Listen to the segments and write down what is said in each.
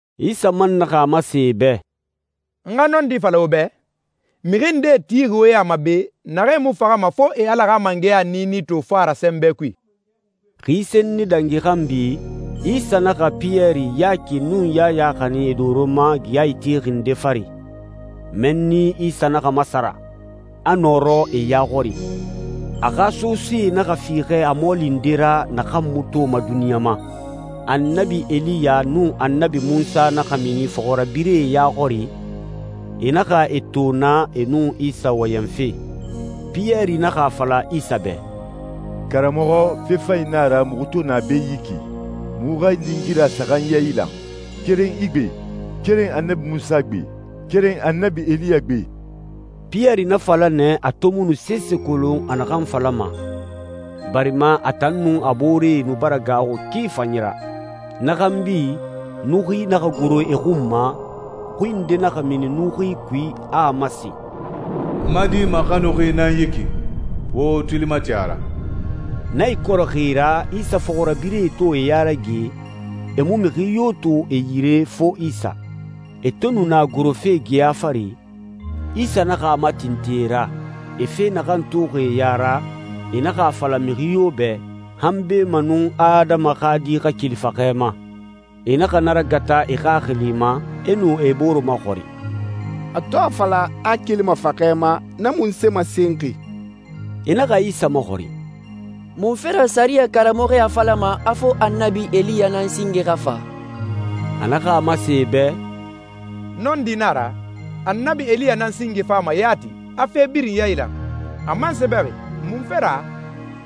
Isa man naxa a masen e bɛ, «N xa nɔndi fala wo bɛ, mixi ndee tixi wo ya ma be, naxee mu faxama fo e Ala xa mangɛya niini to fa ra sɛnbɛ kui.» Xi senni dangi xanbi, Isa naxa Piyɛri, Yaki, nun Yaya xanin e doro ma geya itexi nde fari. Mɛnni Isa naxa masara, a nɔrɔ e ya xɔri. A xa sosee naxa fiixɛ a mɔɔli nde ra naxan mu toma duniɲa ma. Annabi Eliya nun Annabi Munsa naxa mini fɔxirabirɛe ya xɔri, e naxa e to naa e nun Isa wɔyɛnfe. Piyɛri naxa a fala Isa bɛ, «Karamɔxɔ, fe fanyi na a ra muxu to na be yi ki. Muxu xa lingira saxan yailan, keren i gbe, keren Annabi Munsa gbe, keren Annabi Eliya gbe.» Piyɛri na fala nɛ a to mu nu sese kolon a naxan falama, barima a tan nun a booree nu bara gaaxu ki fanyi ra. Na xanbi, nuxui naxa goro e xun ma, xui nde naxa mini nuxui kui, a a masen, «N ma Di maxanuxi nan yi ki. Wo wo tuli mati a ra.» Na ikɔrɔxi ra, Isa fɔxirabirɛe to e ya rage, e mu mixi yo to e yire fo Isa. E to nu na gorofe geya fari, Isa naxa a matintin e ra, e fe naxan toxi e ya ra, e naxa a fala mixi yo bɛ, han beemanun Adama xa Di xa keli faxɛ ma. E naxa na ragata e xaxili ma, e nu e bore maxɔrin, «A to a fala a a kelima faxɛ ma, na munse masenxi?» E naxa Isa maxɔrin, «Munfe ra sɛriyɛ karamɔxɔe a falama a fo Annabi Eliya nan singe xa fa?» A naxa a masen e bɛ, «Nɔndi na a ra. Annabi Eliya nan singe fama yati, a fe birin yailan. A man sɛbɛxi munfe ra,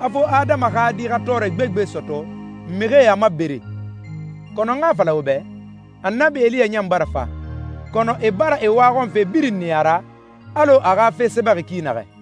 a fo Adama xa Di xa tɔɔrɛ gbegbe sɔtɔ, mixie a mabere? Kɔnɔ n xa a fala wo bɛ, Annabi Eliya ɲan bara fa, kɔnɔ e bara e waxɔnfe birin niya a ra, alɔ a xa fe sɛbɛxi ki naxɛ.»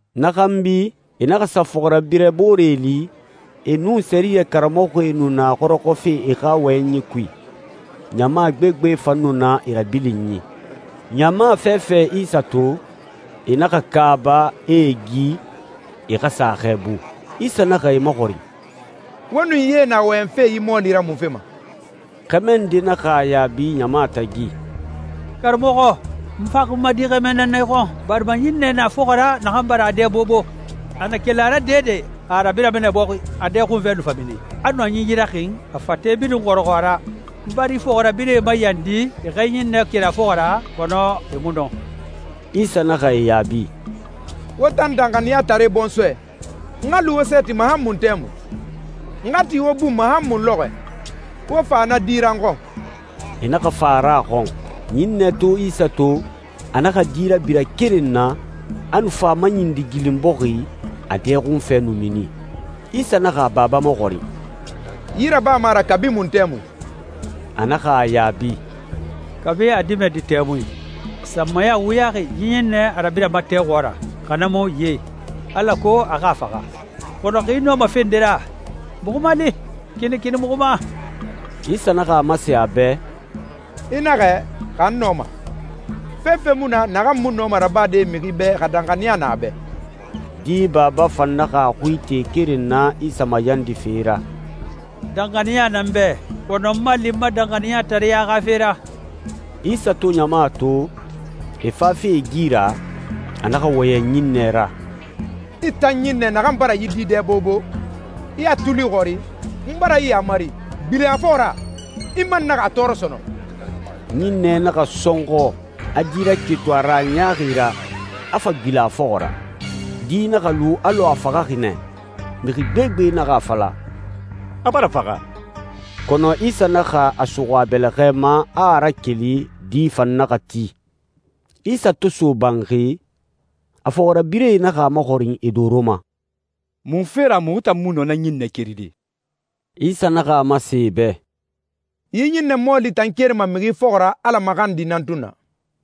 Na xanbi, e naxa sa fɔxirabirɛ booree li, e nun sɛriyɛ karamɔxɔe nu na xɔrɔxɔfe e xa wɔyɛnyie kui, ɲama gbegbe fan nu na e rabilinyi. Ɲama fɛfɛ Isa to, e naxa kaaba, e e gi, e xa sa a xɛɛbu. Isa naxa e maxɔrin, «Wo nun yee na wɔyɛnfe yi mɔɔli ra munfe ma?» Xɛmɛ nde naxa a yaabi ɲama tagi, «Karamɔxɔ, n faxi n ma di xɛmɛ nan na i xɔn, barima ɲinnɛ na a fɔxɔ ra naxan bara a dɛ bobo. A na keli a ra dɛdɛ, a a rabirama nɛ bɔxi, a dɛ xunfɛ nu fa mini, a nu a ɲinyi raxin, a fate birin xɔrɔxɔ a ra. N bara i fɔxirabirɛe mayandi e xa yi ɲinnɛ keri a fɔxɔ ra, kɔnɔ e mu nɔ.» Isa naxa e yaabi, «Wo tan danxaniyatare bɔnsɔɛ, n xa lu wo sɛɛti ma han mun tɛmui? N xa ti wo bun ma han mun lɔxɔɛ? Wo fa na di ra n xɔn.» E naxa fa a ra a xɔn. Ɲinnɛ to Isa to, a naxa di rabira keren na, a nu fa a maɲindigilin bɔxi, a dɛ xunfɛ nu mini. Isa naxa a baba maxɔrin, «Yi rabama a ra kabi mun tɛmui?» A naxa a yaabi, «Kabi a dimɛdi tɛmui. Sanmaya wuyaxi yi ɲinnɛ a rabirama tɛ xɔɔra, xa na mu ye, alako a xa a faxa. Kɔnɔ xa i nɔma fe nde ra, muxu mali. Kinikini muxu ma!» Isa naxa a masen a bɛ, «I naxɛ, xa n nɔma. Fefe mu na naxan mu nɔma rabade mixi bɛ xa danxaniya na a bɛ.» Di baba fan naxa a xui ite keren na Isa mayandife ra, «Danxaniya na n bɛ, kɔnɔ n mali n ma danxaniyatareɲa xa fe ra!» Isa to ɲama to, e fafe e gi ra, a naxa wɔyɛn ɲinnɛ ra, «I tan ɲinnɛ naxan bara yi di dɛ bobo, i a tuli xɔri, n bara i yaamari, gbilen a fɔxɔ ra, i man naxa a tɔɔrɔ sɔnɔn!» Ɲinnɛ naxa sɔnxɔ, a di raketun a ra a ɲaaxi ra, a fa gbilen a fɔxɔ ra. Di naxa lu alɔ a faxaxi nɛ. Mixi gbegbe naxa a fala, «A bara faxa.» Kɔnɔ Isa naxa a suxu a bɛlɛxɛ ma, a a rakeli, di fan naxa ti. Isa to so banxi, a fɔxirabirɛe naxa a maxɔrin e doro ma, «Munfe ra muxu tan mu nɔ na ɲinnɛ keride?» Isa naxa a masen e bɛ, «Yi ɲinnɛ mɔɔli tan kerima mixi fɔxɔ ra Ala maxandi nan tun na.»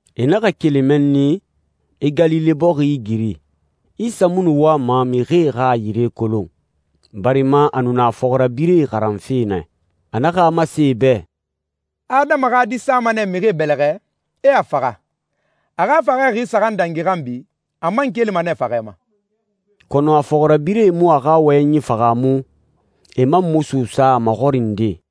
E naxa keli mɛnni, e Galile bɔxi igiri. Isa mu nu wama mixie xa a yire kolon, barima a nu na a fɔxirabirɛe xaranfe nɛ. A naxa a masen e bɛ, «Adama xa Di sama nɛ mixie bɛlɛxɛ, e a faxa. A xa faxɛ xi saxan dangi xanbi, a man kelima nɛ faxɛ ma.» Kɔnɔ a fɔxirabirɛe mu a xa wɔyɛnyi fahaamu, e man mu suusa a maxɔrinde.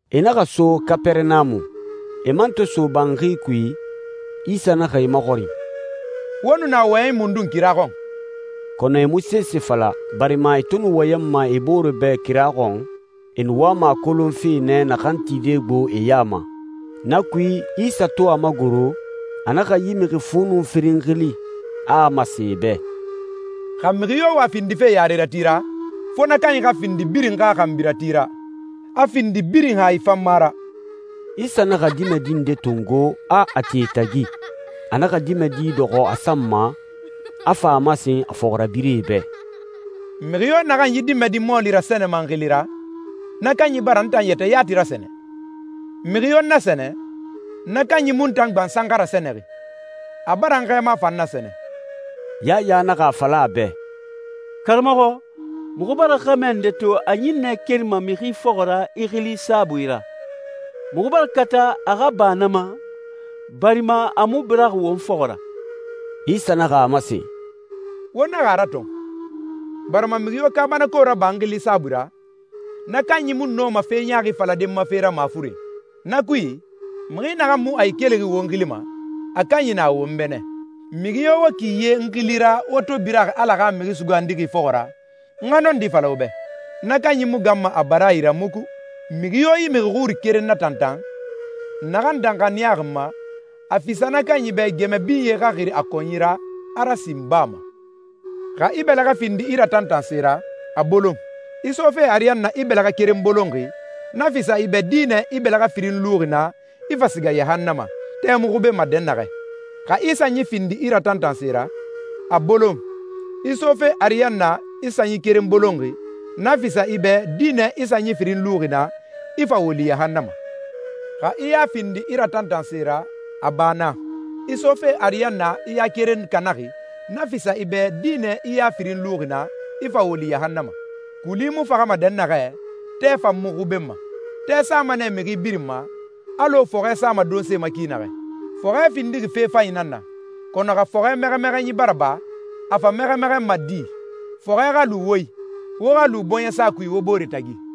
E naxa so Kapɛrɛnamu. E man to so banxi kui, Isa naxa e maxɔrin, «Wo nu na wɔyɛnyi mundun kira xɔn?» Kɔnɔ e mu sese fala, barima e to nu wɔyɛnma e bore bɛ kira xɔn, e nu wama a kolonfe nɛ naxan tide gbo e ya ma. Na kui, Isa to a magoro, a naxa yi mixi fu nun firin xili, a a masen e bɛ, «Xa mixi yo wa findife yarerati ra, fo na kanyi xa findi birin xa xanbirati ra, a findi birin hayi fanma ra.» Isa naxa dimɛdi nde tongo, a a ti e tagi. A naxa dimɛdi dɔxɔ a san ma, a fa a masen a fɔxirabirɛe bɛ, «Mixi yo naxan yi dimɛdi mɔɔli rasɛnɛma n xili ra, na kanyi bara n tan yɛtɛ yati rasɛnɛ. Mixi yo n nasɛnɛ, na kanyi mu n tan gbansan xa rasɛnɛxi. A bara n xɛɛma fan nasɛnɛ.» Yaya naxa a fala a bɛ, «Karamɔxɔ, muxu bara xɛmɛ nde to a ɲinnɛ kerima mixi fɔxɔ ra i xili saabui ra. Muxu bara kata a xa ba na ma, barima a mu biraxi won fɔxɔ ra.» Isa naxa a masen, «Wo naxa a ratɔn, barima mixi yo kaabanako raba n xili saabui ra, na kanyi mu nɔma fe ɲaaxi falade n ma fe ra mafuren. Na kui, mixi naxan mu a ikelixi won xili ma, a kanyi na won bɛ nɛ. Mixi yo wo ki ye n xili ra wo to biraxi Ala xa Mixi Sugandixi fɔxɔ ra, n xa nɔndi fala wo bɛ, na kanyi mu ganma a baraayi ra muku.» «Mixi yo yi mixi xuri keren natantan, naxan danxaniyaxi n ma, a fisa na kanyi bɛ gɛmɛ binye xa xiri a kɔnyi ra, a rasin baa ma. Xa i bɛlɛxɛ findi i ratantanse ra, a bolon. I sofe ariyanna i bɛlɛxɛ keren bolonxi, na fisa i bɛ dinɛ i bɛlɛxɛ firin luxi na, i fa siga yahannama, tɛ mu xubenma dɛnnaxɛ. Xa i sanyi findi i ratantanse ra, a bolon. I sofe ariyanna i sanyi keren bolonxi, na fisa i bɛ dinɛ i sanyi firin luxi na, i fa woli yahannama. Xa i ya findi i ratantanse ra, a ba na. I sofe ariyanna i ya keren kanaxi, na fisa i bɛ dinɛ i ya firin luxi na, i fa woli yahannama, kuli mu faxama dɛnnaxɛ, tɛ fan mu xubenma.» «Tɛ sama nɛ mixi birin ma, alɔ fɔxɛ sama donse ma ki naxɛ. Fɔxɛ findixi fe fanyi nan na, kɔnɔ xa fɔxɛ mɛxɛmɛxɛnyi bara ba, a fa mɛxɛmɛxɛnma di? Fɔxɛ xa lu wo i, wo xa lu bɔɲɛsa kui wo bore tagi.»